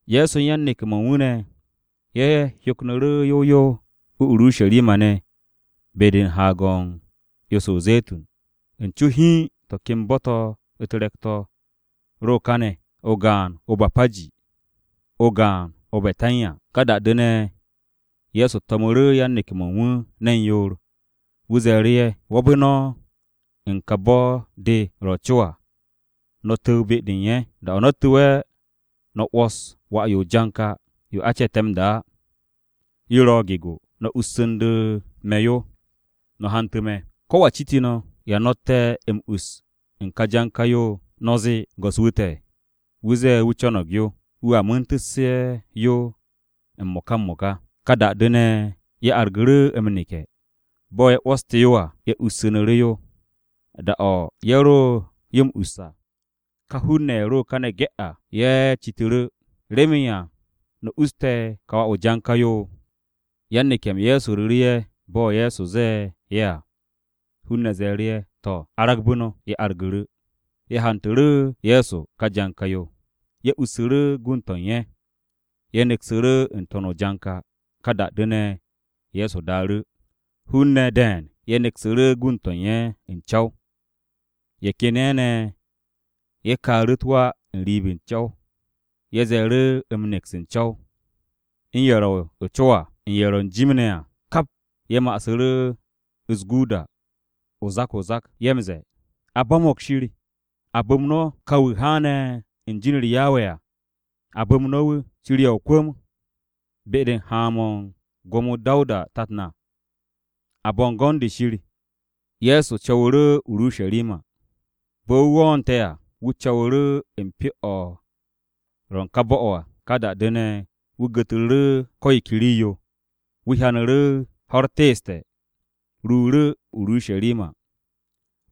Ye̱so u̱n yan-neke̱-mo̱ u̱n wu̱ ne̱, ye̱ hyoknu̱ru̱ yow yow o-Urusharima ne̱ be-de u̱n Haag-o̱ u̱n 'yo-se o-Ze̱tun. U̱n co hiin to̱ ken bo̱-to̱ u̱t-re̱k-to̱ ro káne̱: o-gaan o-Bapaji, o-gaan o-Betanya. Ka da-de ne̱, Ye̱so to̱mu̱ru̱ yan-neke̱-mo̱ u̱n wu̱ ne̱n yoor. Wu̱ ze̱e̱ru̱ ye̱, “Wo̱be̱ no̱ u̱n ka bo̱-de ro̱ o-co à, no̱ tu̱w be-de u̱n ye̱. Da-o̱ no̱ tu̱we̱, no̱ 'wo̱s wà-yo o-janka yo a ce̱te̱ m-da á. Yo ro̱ gego. No̱ ussu̱ndu̱ me̱ yo, no̱ hantu̱ me̱. Kowa citu̱ no̱, ‘¿Ya no̱tte̱ m-us u̱n ka janka-yo?’ No̱ zee, ‘Go̱s-wu̱ te̱, wu̱ zee wu̱ co̱no̱g yo. Wu̱a mu̱u̱ntu̱sse̱ yo m-mo̱ka m-mo̱ka.’” Ka da-de ne̱, ye̱ argu̱ru̱ m-neke̱. Bo̱ ye̱ 'wo̱ste̱ yo à, ye̱ ussu̱nu̱ru̱ yo. Da-o̱ ye̱ ro yo m-us à, ka hun-ne̱ ye̱ ro kane̱ ge̱ à, ye̱ citu̱ru̱, “¿Remen ya no̱ usste̱ ka wà-yo o-janka yo?” Yan-neke̱-m Ye̱so ru̱ru̱ ye̱ bo̱ Ye̱so zee ye̱ à. Hun-ne̱ ze̱e̱ru̱ ye̱, “To̱, aragbu̱ no̱.” Ye̱ argu̱ru̱. Ye̱ hantu̱ru̱ Ye̱so ka janka-yo. Ye̱ ussu̱ru̱ gund-to̱ u̱n ye̱. Ye̱ neksu̱ru̱ n-to̱n o-janka. Ka da-de ne̱, Ye̱so daaru̱. Hun-ne̱ de̱e̱n ye̱ neksu̱ru̱ gund-to̱ u̱n ye̱ u̱n co̱w. Ye̱ ken ye̱ ne̱ ye̱ kaaru̱ u̱t-wa n-riib o-co̱w. Ye̱ ze̱e̱ru̱ m-neks u̱n co̱w. U̱n ye̱ ro̱ o-co à, u̱n ye̱ ro̱ u̱n jim ne̱ à, kap ye̱ ma'asu̱ru̱ u̱s-guuda zak-o-zak. Ye̱ m-ze̱e̱, “A bo̱mo̱g Shir!” “A bu̱m no̱ ka wu̱ haane̱ u̱n be̱e̱b-u̱r Yawe à. A bu̱m no̱ wu̱!” “Shir 'ye o-kwu̱m be-de u̱n haan-mo̱ u̱n gwo̱mo-u̱t Dawuda tat na.” “A bu̱m no̱ Shir n-To̱n!” Ye̱so co̱wu̱ru̱ o-Urusharima. Bo̱ wu̱ wo̱o̱nte̱ à, wu̱ co̱wu̱ru̱ u̱n Pyo-o̱ Shir o̱ ro̱ u̱n ka bo̱-o̱ à. Ka da-de ne̱, wu̱ gu̱tru̱ru̱ ko̱ yo ke rii-yo. Wu̱ hyanu̱ru̱ ho̱-u̱r teeste̱, wu̱ ruuru̱ o-Urusharima,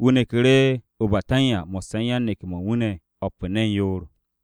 wu̱ neku̱ru̱ o-Betanya mo̱sse̱ u̱n yan-neke̱-mo̱ u̱n wu̱ ne̱ o̱p u̱n ne̱n yoor.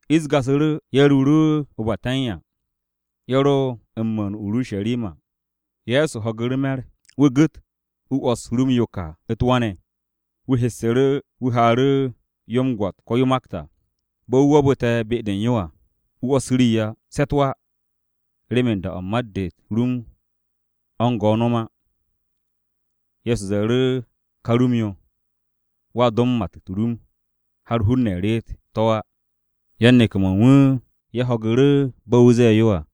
Ish gasu̱ru̱, ye̱ ruuru̱ o-Betanya. Ye̱ ro m-mu̱u̱n o-Urusharima, Ye̱so ho̱gu̱ru̱ me̱r. Wu̱ gu̱t, wu̱ 'wo̱s rum-yo ka u̱t-wa ne̱. Wu̱ hessu̱ru̱, wu̱ haaru̱ yo m-gwo̱t ko̱ yo makt à. Bo̱ wu̱ wo̱o̱bu̱te̱ be-de u̱n yo à, wu̱ 'wo̱s rii á, se̱ u̱t-wa remen da-o̱ u̱n mat-de u̱t-rum o̱ u̱n go no̱m á. Ye̱so ze̱e̱ru̱ ka rum-yo, “Wo̱a do m-mat u̱t-rum har hun-ne̱ reet to̱ á.” Yan-neke̱-mo̱ u̱n wu̱ ye̱ ho̱gu̱ru̱ bo̱ wu̱ ze̱e̱ yo à.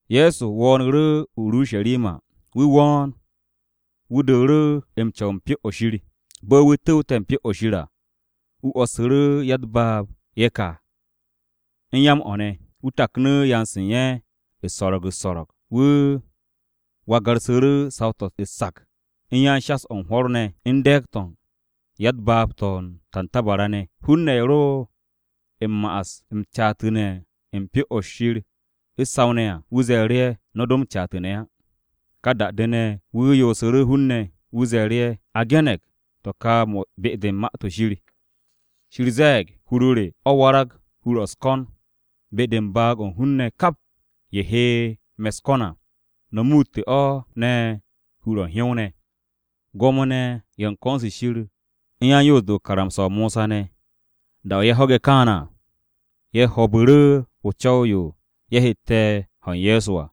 Ye̱so wo̱o̱nu̱ru̱ o-Urusharima. Wu̱ wo̱o̱n, wu̱ dooru̱ m-co̱w u̱n Pyo-o̱ Shir. Bo̱ wu̱ tu̱wte̱ u̱n Pyo-o̱ Shir à, wu̱ 'wo̱ssu̱ru̱ ya-u̱t-baab ye̱ ka u̱n ya-m-o̱ ne̱. Wu̱ taknu̱ yanse̱ u̱n ye̱ u̱s-so̱ro̱g u̱s-so̱ro̱g. Wu̱ wagarsu̱ru̱ saw-to̱ u̱t-sak u̱n yan-shas-o̱ u̱n hwo̱r ne̱ u̱n de̱e̱g-to̱ u̱n ya-u̱t-baab to̱ u̱n tantabara ne̱. Hun-ne̱ ye̱ ro m-ma'as m-caatu̱ne̱ u̱n Pyo-o̱ Shir u̱s-saw ne̱ à, wu̱ ze̱e̱ru̱ ye̱, “No̱ do m-caatu̱ne̱ á.” Ka da-de ne̱, wu̱ yoosu̱ru̱ hun-ne̱, wu̱ ze̱e̱ru̱ ye̱, “A ge̱ne̱g to̱ ka ma-to̱ be-de u̱n Ma-to̱ Shir. Shir ze̱e̱g, “ ‘Hur-o re o̱ warag hur-o̱ u̱s-ko̱n be-de u̱n baag-o̱ u̱n hun-ne̱ kap ye̱ he me̱ u̱s-ko̱n à.’ No̱ muutte̱ o̱ ne̱ hur-o̱ u̱n hyow-ne̱.” Gwo̱mo-ne̱ ye̱ u̱n ko̱n-se Shir u̱n yan-Yoos-de u̱n karamsa-o Mosa ne̱, da-o̱ ye̱ ho̱ge̱ kaane̱ à, ye̱ ho̱o̱bu̱ru̱ o-co̱w yo ye̱ hette̱ ho̱ u̱n Ye̱so à.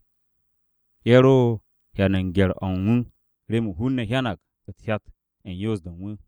Ye̱ ro hyan u̱n gye̱r-o̱ u̱n wu̱, remen hun-ne̱ hyanag u̱t-hyat u̱n yoos-de u̱n wu̱.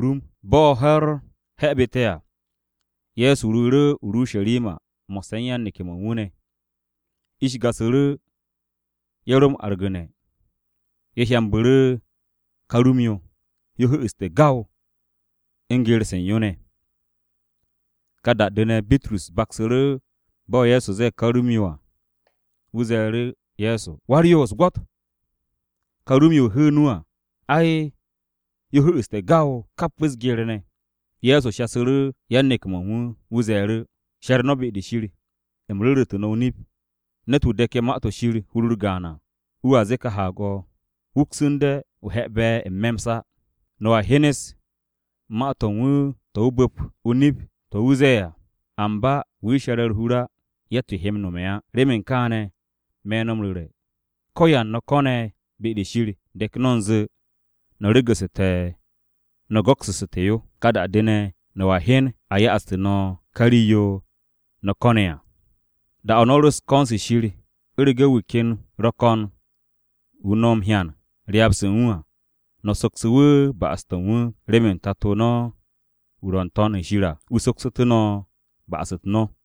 Bo̱ ho̱-u̱r he̱bu̱te̱ à, Ye̱so ruuru̱ o-Urusharima mo̱sse̱ u̱n yan-neke̱-mo̱ u̱n wu̱ ne̱. Ish gasu̱ru̱, ye̱ ro m-argu̱ne̱. Ye̱ hyambu̱ru̱ ka rum-yo. Yo hu̱'u̱ste̱ gaw u̱n geer-se u̱n yo ne̱. Ka da-de ne̱, Bitrus baksu̱ru̱ bo̱ Ye̱so ze̱e̱ ka rum-yo à. Wu̱ ze̱e̱ru̱ Ye̱so, “Wa-u̱s-Nap, gwo̱t! Ka rum-yo o hu̱u̱ nu à, ai, yo hu̱'u̱ste̱ gaw, kap u̱s-geer ne̱.” Ye̱so shasu̱ru̱ yan-neke̱-mo̱ u̱n wu̱, wu̱ ze̱e̱ru̱, “She̱r no̱ be-de Shir. Nip-o̱ me̱ no̱ m-ru̱re̱, ne̱t-wu̱ de̱ke̱ Ma-to̱ Shir hur-u̱r gaan à wu̱a zee ka haag-o̱ ‘Wuksu̱nde o he̱'e̱be̱ n-me̱ m-sa.’ No̱a hyenes ma-to̱ u̱n wu̱ to̱a bu̱p o-nip to̱ wu̱ ze̱e̱ à. Amba wu̱ she̱re̱ u̱r-hur á, yatt-yo he m-nome̱ á. Remen kaane̱, me̱ no̱ m-ru̱re̱, ko̱yan no̱ ko̱ne̱ be-de Shir, de̱k no̱ u̱nze no̱ regu̱su̱te̱ no̱ go̱ksu̱ssu̱te̱ yo. Ka da-de ne̱, no̱a hyen a ya'aste̱ no̱ ka rii-yo no̱ ko̱ne̱ à. Da-o̱ no̱ ro u̱n ko̱n-se Shir, u̱rege̱ wu̱ ken ro̱ ko̱n wu̱ no̱ m-hyan ryaab-se u̱n wu̱ à, no̱ soksu̱ wu̱ ba'as-to̱ u̱n wu̱, remen Tato no̱ wu̱ ro̱ n-To̱n shir à, wu̱ soksu̱tú̱ no̱ ba'as-u̱t no̱.”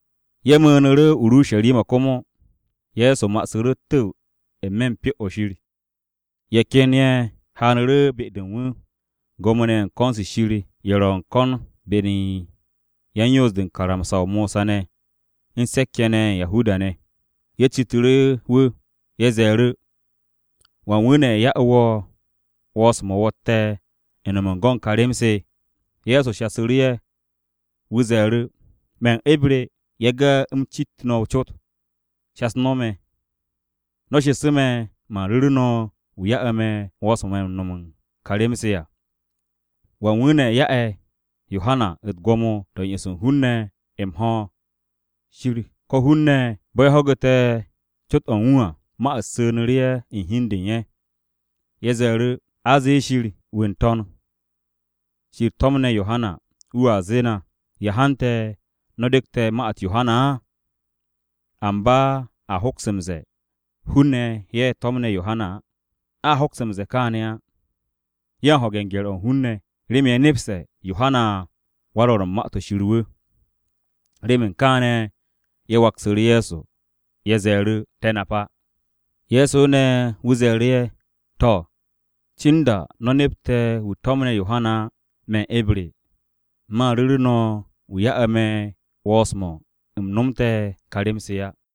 Ye̱ mu̱u̱nu̱ru̱ o-Urusharima komo, Ye̱so ma'asu̱ru̱ u̱t-tu̱w n-me̱ u̱n Pyo-o̱ Shir. Ye̱ ken ye̱ haanu̱ru̱ be-de u̱n wu̱. Gwo̱mo-ne̱ ye̱ u̱n ko̱n-se Shir ye̱ ro̱ ko̱n be-de u̱n ye̱ u̱n yan-Yoos-de u̱n karamsa-o Mosa ne̱ u̱n se̱k-ye̱ ye̱ u̱n Yahuda-ne̱. Ye̱ citu̱ru̱ wu̱, ye̱ ze̱e̱ru̱, “¿Wan wu̱ ne̱ ya'e̱ wo̱ 'wo̱ns-mo̱ wo̱tte̱ u̱n no̱m u̱n go̱n ka rem-se?” Ye̱so waksu̱ru̱ ye̱, wu̱ ze̱e̱ru̱, “Me̱ eb re, yage̱ u̱m m-cit no̱ o-cot. Shas no̱ me̱. No̱ shesu̱ me̱, man ru̱ru̱ no̱ wu̱ ya'e̱ me̱ 'wo̱ns-mo̱ u̱n no̱m u̱n ka rem-se à. ¿Wan wu̱ ne̱ ya'e̱ Yohana u̱t-gwo̱mo to̱ u̱n yo'os u̱n hun-ne̱ m-ho̱: Shir ko̱ hun-ne̱?” Bo̱ ye̱ ho̱gu̱te̱ cot-o̱ u̱n wu̱ à, ma-u̱t su̱nu̱ru̱ ye̱ u̱n hi u̱n de u̱n ye̱. Ye̱ ze̱e̱ru̱, “A zee ‘Shir, wu̱ u̱n n-To̱n shir to̱mne̱ Yohana,’ wu̱a zee na, ‘¿Ya hante̱ no̱ de̱kte̱ ma-u̱t Yohana á?’ ¿Amba a hoks m-ze̱e̱, ‘Hun-ne̱ ye̱ to̱mne̱ Yohana’? A hoks m-ze̱e̱ kaane̱ á.” Ye̱ u̱n ho̱ge̱ u̱n gye̱r-o̱ u̱n hun-ne̱, remen ye̱ nepste̱ Yohanawan-Rwo̱r u̱n Ma-to̱ Shir wu̱. Remen kaane̱, ye̱ waksu̱ru̱ Ye̱so, ye̱ ze̱e̱ru̱, “Te̱ nap á.” Ye̱so ne̱ wu̱ ze̱e̱ru̱ ye̱, “To̱, cin da no̱ nepte̱ wu̱ to̱mne̱ Yohana á, me̱ eb re, man ru̱ru̱ no̱ wu̱ ya'e̱ me̱ 'wo̱ns-mo̱ u̱m nomte̱ ka rem-se á.”